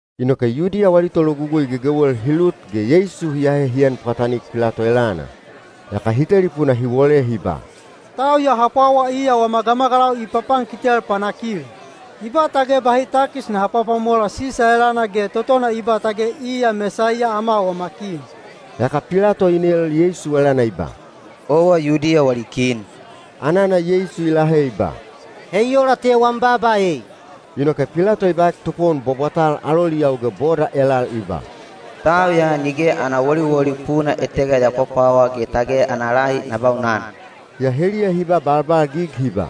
Inoke Yudiya wali tologugui gegewel hi lut ge Yeisu hi ahe hi en pwatanik Pilato elana. Yaka hi telipuna hi wole hi ba, “Tau ya ha pwawa iya wama gamagalau i papankitel panakil. I ba tage bahi takis naha pwapwamola Sisa elana ge totona i ba tage iya Mesaiya ama wama kin.” Yaka Pilato i nel Yeisu elana i ba, “Owa Yudiya wali kin?” Anana Yeisu i lahe i ba, “He i ola te wam baaba ei.” Inoke Pilato i baek topowon bwabwatal aloliyau ge boda elal i ba, “Tau ya nige ana woliwoli puna etega ya pwapwawa ge tage ana lahi na baunan.” Yaa heliya hi ba balbalgig hi ba,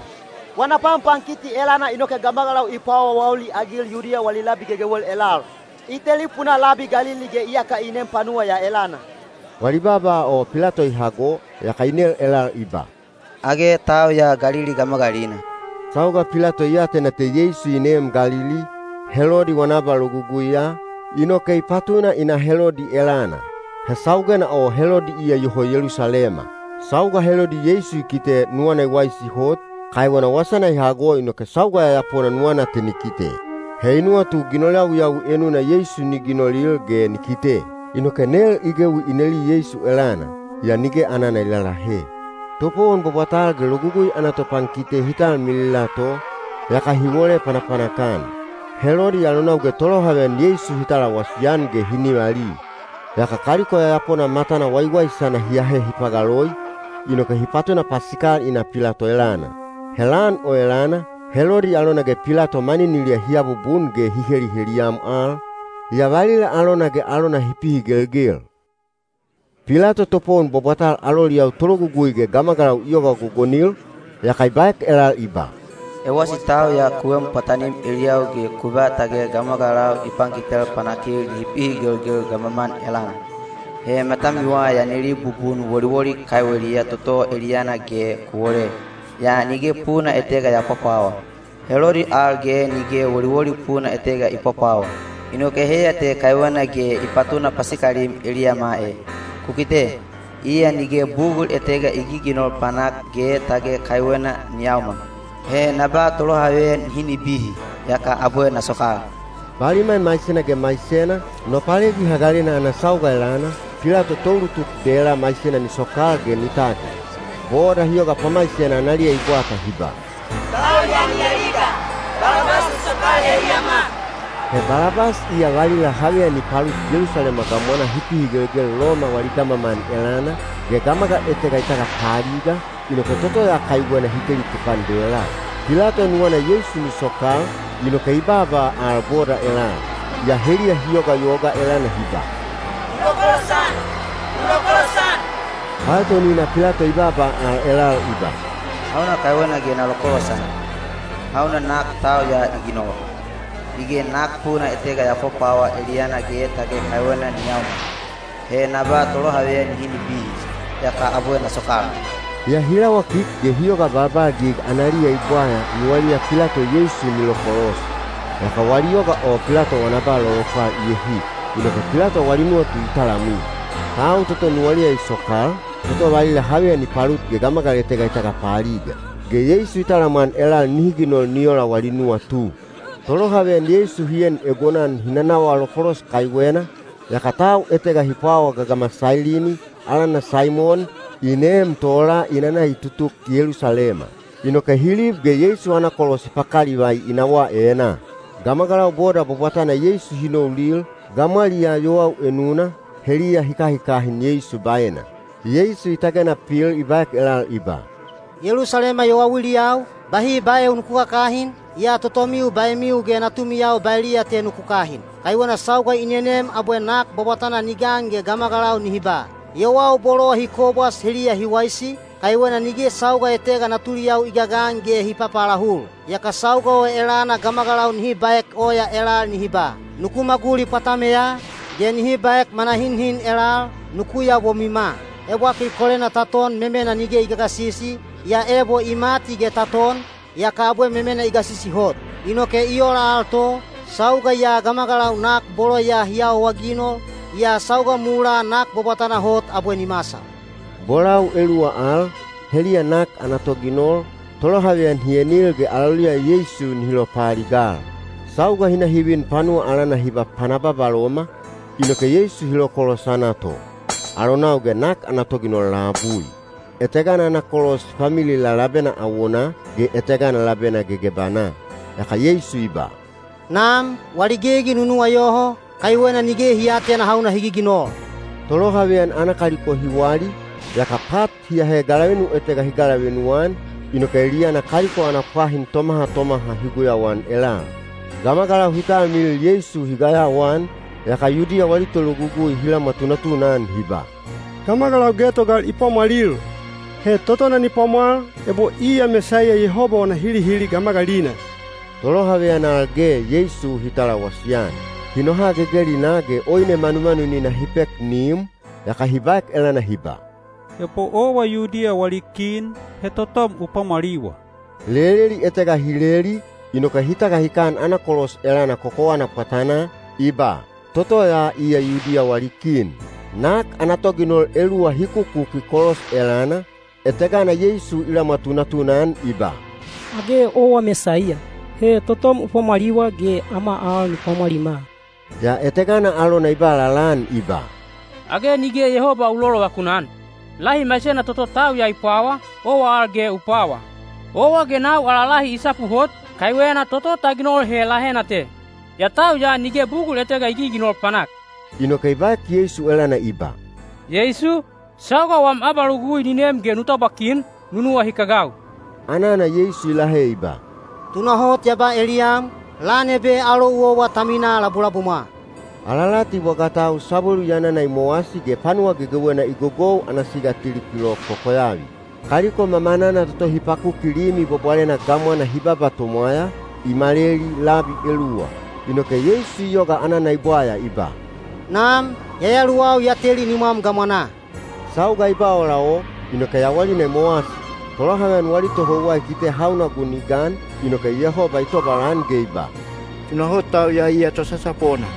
“Wana panpankiti elana inoke gamagalau i paawaawauli-agil Yudiya wali labi gegewel elal. I telipunaa labi Galili ge iyaka i nem te panuwa ya elana.” Wali baaba o Pilato i hago, yaka i nel elal i ba, “Age tau ya Galili gamagalina?” Sauga Pilato i atena te Yeisu i neem Galili, Helodi wana abaloguguiya, inoke i patuna i na Helodi elana. He saugena o Helodi iya iyoho Yelusalema. Sauga Helodi Yeisu i kite nuwana i waisi hot, kaiwena wasana i hago inoke sauga yayapona nuwana te ni kite. He i nuwatu ginol yawiyawi enuna Yeisu ni ginolil ge ni kite. Inoke nel i gewi i neli Yeisu elana, yaa nige anana i lalahe. Topowon bwabwatal ge Logugui ana topankite hi talmilila to, yaka hi wole panapanak-an. Helodi alonau ge tolohaveyan Yeisu hi talawasi-an ge hi nivali. Yaka kaliko yayapona matana waiwaisana hi ahe hi pagaloi, inoke hi patuna pasikal i na Pilato elana. He lan o elana, Helodi alona ge Pilato maniniliya hi abubun ge hi heliheliyam al, yaa valila alona ge alona hi pihigelgel. Pilato topowon bwabwatal aloliyau tologugui ge gamagalau i yoga gogonil, yaka i baek elal i ba, “Ewasi tau ya ku en pwatanim eliyau ge ku ba tage gamagalau i pankitel panakil nihi pihigelgel gamaman elana. He matamiwa ya neli bubun woliwoli kaiweliya toto eliyana ge ku wole, yaa nige puna etega ya pwapwawa. Helodi al ge nige woliwoli puna etega i pwapwawa, inoke heiya te kaiwena ge i patuna pasikalim eliyama e. Ku kite, iya nige bugul etega i giginol panak ge tage kaiwena ni yaomal. He na ba tolohaveyan nihi nibihi, yaka abwe na sokal.” (Baliman maisena ge maisena, Nopalegi Hagalena ana sauga elana, Pilato toulutuk dela maisena ni sokal ge ni tagil.) Boda hi yoga pamaisena analiya i bwata hi ba, “Tau ya ni aliga! Balabas u sokal eliyama!” (He Balabas iya valila haveyan i palut Yelusalema gamwanaa hi pihigelgel Loma wali gamaman elana, ge gamagal etega i tagapaaliga, inoke toto ya kaiwena hi teli tukan dela.) Pilato nuwana Yeisu ni sokal, inoke i baaba al boda elal. Yaa heliya hi yogayoga elana hi ba, “U lokolosan! U lokolosan!” Paetonina Pilato i baaba al elal i ba, “Hauna kaiwena ge na lokolosan? Hauna nak tau ya i ginol? Nige nak puna etega ya pwapwawa eliyana ge tage kaiwena ni yaomal. He na ba tolohaveyan nihi nibihi, yaka abwe na sokal.” Yaa hi lawakik ge hi yoga balbalgig analiya i bwaya nuwaliya Pilato Yeisu ni lokolos. Yaka wali yoga o Pilato wana ba lolopwal i ehik. Inoke Pilato wali nuwatu i talamwi. Tau toto nuwaliya i sokal, toto valila haveyan i palut ge gamagal etega i tagapaaliga. Ge Yeisu i talamwan elal nihi ginol ni ola wali nuwatu. Tolohaveyan Yeisu hi en egonan hi nanawa lokolos kaiwena, yaka tau etega hi pwawa gagama Sailini, alana Saimon, i neem tola i nana i tutuk Yelusalema. Inoke hi lib ge Yeisu ana kolos hi pakalivai i nawaa enaa. Gamagalau boda bwabwatana Yeisu hi noulil, gamwaliyaa yowau enuna, heliya hi kahikahin Yeisu baena. Yeisu i tagena pil i baek elal i ba, “Yelusalema yowauiliyau, bahi baeu nuku kakahin, yaa totomiu baemiu ge natumiyau baeliya te nuku kahin. Kaiwena sauga i nenem abwe nak bwabwatana ni gan ge gamagalau nihi ba, ‘Yowau bolo hi kobwas heliya hi waisi, kaiwena nige sauga etega natuliyau i gagan ge hi papaalahul.’ Yaka sauga o elana gamagalau nihi baek oya elal nihi ba, ‘Nuku maguli pwatameya,’ ge nihi baek manahinhin elal, ‘Nuku yabomwima.’ Ebwakil kolena ta ton memena nige i gagasisi, yaa ebo i mati ge ta ton, yaka abwe memena i gasisi hot. Inoke i ola al to, sauga ya gamagalau nak bolo ya hi awaginol, yaa sauga mulaa nak bwabwatana hot abwe ni masal.” Bolau eluwa al, heliya nak ana toginol, tolohaveyan hi enil ge aloliya Yeisu nihi lopaaligal. Sauga hi na hi vin panuwa alana hi ba Pana Babaloma, inoke Yeisu hi lokolosana to, alonau ge nak ana toginol labui. Etegana ana kolos hi pamilila labena awonaa, ge etegana labena gegebanaa. Yaka Yeisu i ba, “Nam, wali gegi nu nuwayoho, kaiwena nige hi aatena hauna hi giginol.” Tolohaveyan ana kaliko hi wali, yaka pat hi ahe galavenu etega hi galavenu-an, inoke eliyana kaliko ana pwahin tomaha tomaha hi guyauan elal. Gamagalau hi talmilil Yeisu hi gayawaan, yaka Yudiya wali tologugui hi lamwa tunatuna-an hi ba, “Gamagalau getogal i pwamwalil. He totona ni pwamwal, ebo iya Mesaiya Yehoba wana hilihili gamagalina.” Tolohaveyan al ge Yeisu hi talawasi-an. Hi noha gegelinaa ge oine manumanunina hi pek ni im, yaka hi baek elana hi ba, “Ebo owa Yudiya wali kin, he totom u pwamwaliwa.” Leleli etega hi leli, inoke hi tagahikan ana kolos elana kokowana pwatanaa, i ba, “Toto ya iya Yudiya wali kin.” Nak ana toginol eluwa hi kukuki kolos elana, etegana Yeisu i lamwa tunatuna-an i ba, “Age owa Mesaiya? He totom u pwamwaliwa ge ama al nu pwamwalima!” Yaa etegana alona i ba lalaan i ba, “Age nige Yehoba u lolovakun-an? Lahi maisena toto tau ya i pwawa, owa al ge u pwawa. Owa ge nau ala lahi i sapu hot, kaiwena toto ta ginol he lahena te. Yaa tau ya nige bugul etega i giginol panak.” Inoke i baek Yeisu elana i ba, “Yeisu, sauga wam abalogugui ni nem ge nu tabwa kin, nu nuwahikagau.” Anana Yeisu i lahe i ba, “Tunahot ya ba eliyam, lan ebe alou owa ta minaa labulabumwa.” Alalati bwagatau sabwelu yanana i mowasi ge panuwa gegewena i gogou ana siga tili kilok kokoyavi. Kaliko mamanana toto hi pakuki Limi Bwabwalena gamwana hi baba tomwaya, i maleli labi eluwa. Inoke Yeisu i yoga anana i bwaya i ba, “Nam, yayaluwau ya teli nimwam gamwanaa.” Sauga i ba ola o, inoke yawalina i mowasi. Tolohaveyan wali tohouwa i kite hauna gun i gan, inoke Yehoba i tobalan ge i ba, “Tunahot tau ya iya tosasapona.”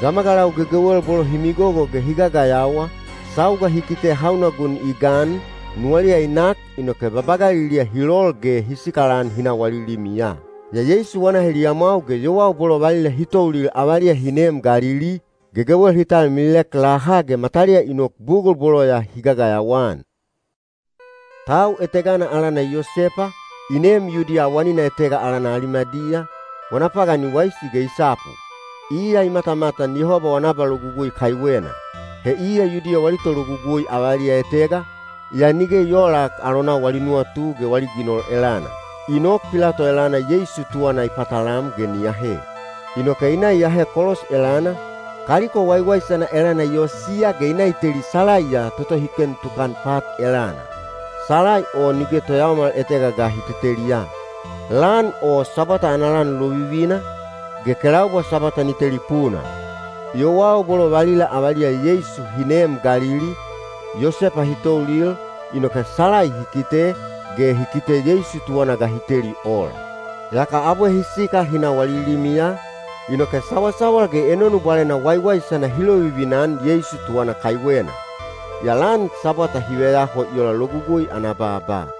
Gamagalau gegewel bolo hi migogo ge hi gagayawa, sauga hi kite hauna gun i gan, nuwaliya i nak inoke babagaliliya hi lol ge hi sikalan hi na wali limiya. Yaa Yeisu wana heliyamwau ge yowau bolo valila hi toulil avaliya hi neem Galili, gegewel hi talmililek laha ge mataliya i nok bugul bolo ya hi gagayawa-an. Tau etegana alana Yosepa, i neem Yudiya awanina etega alana Alimadiya, wana pagan i waisi ge i sapu. Iya i matamatan Yehoba wana abalogugui kaiwena. He iya Yudiya wali tologugui avaliya etega, yaa nige i oolak alonau wali nuwatu ge wali ginol elana. I nok Pilato elana Yeisu tuwana i patalam ge ni ahe. Inoke i na i ahe kolos elana, kaliko waiwaisana elana i osiya ge i na i teli salaiya toto hi ken tukan pat elana. Salai o nige toyaomal etega ga hi teteliya. Lan o Sabwata ana lan lovivina, ge kelaubwa Sabwata ni telipuna. Yowau bolo valila avaliya Yeisu hi neem Galili, Yosepa hi toulil, inoke salai hi kite, ge hi kite Yeisu tuwana ga hi teli ola. Yaka abwe hi sikal hi na wali limiya, inoke sawasawal ge enonu bwalena waiwaisana hi lovivina-an Yeisu tuwana kaiwena. Yaa lan Sabwata hi veyaho i ola Logugui ana baaba.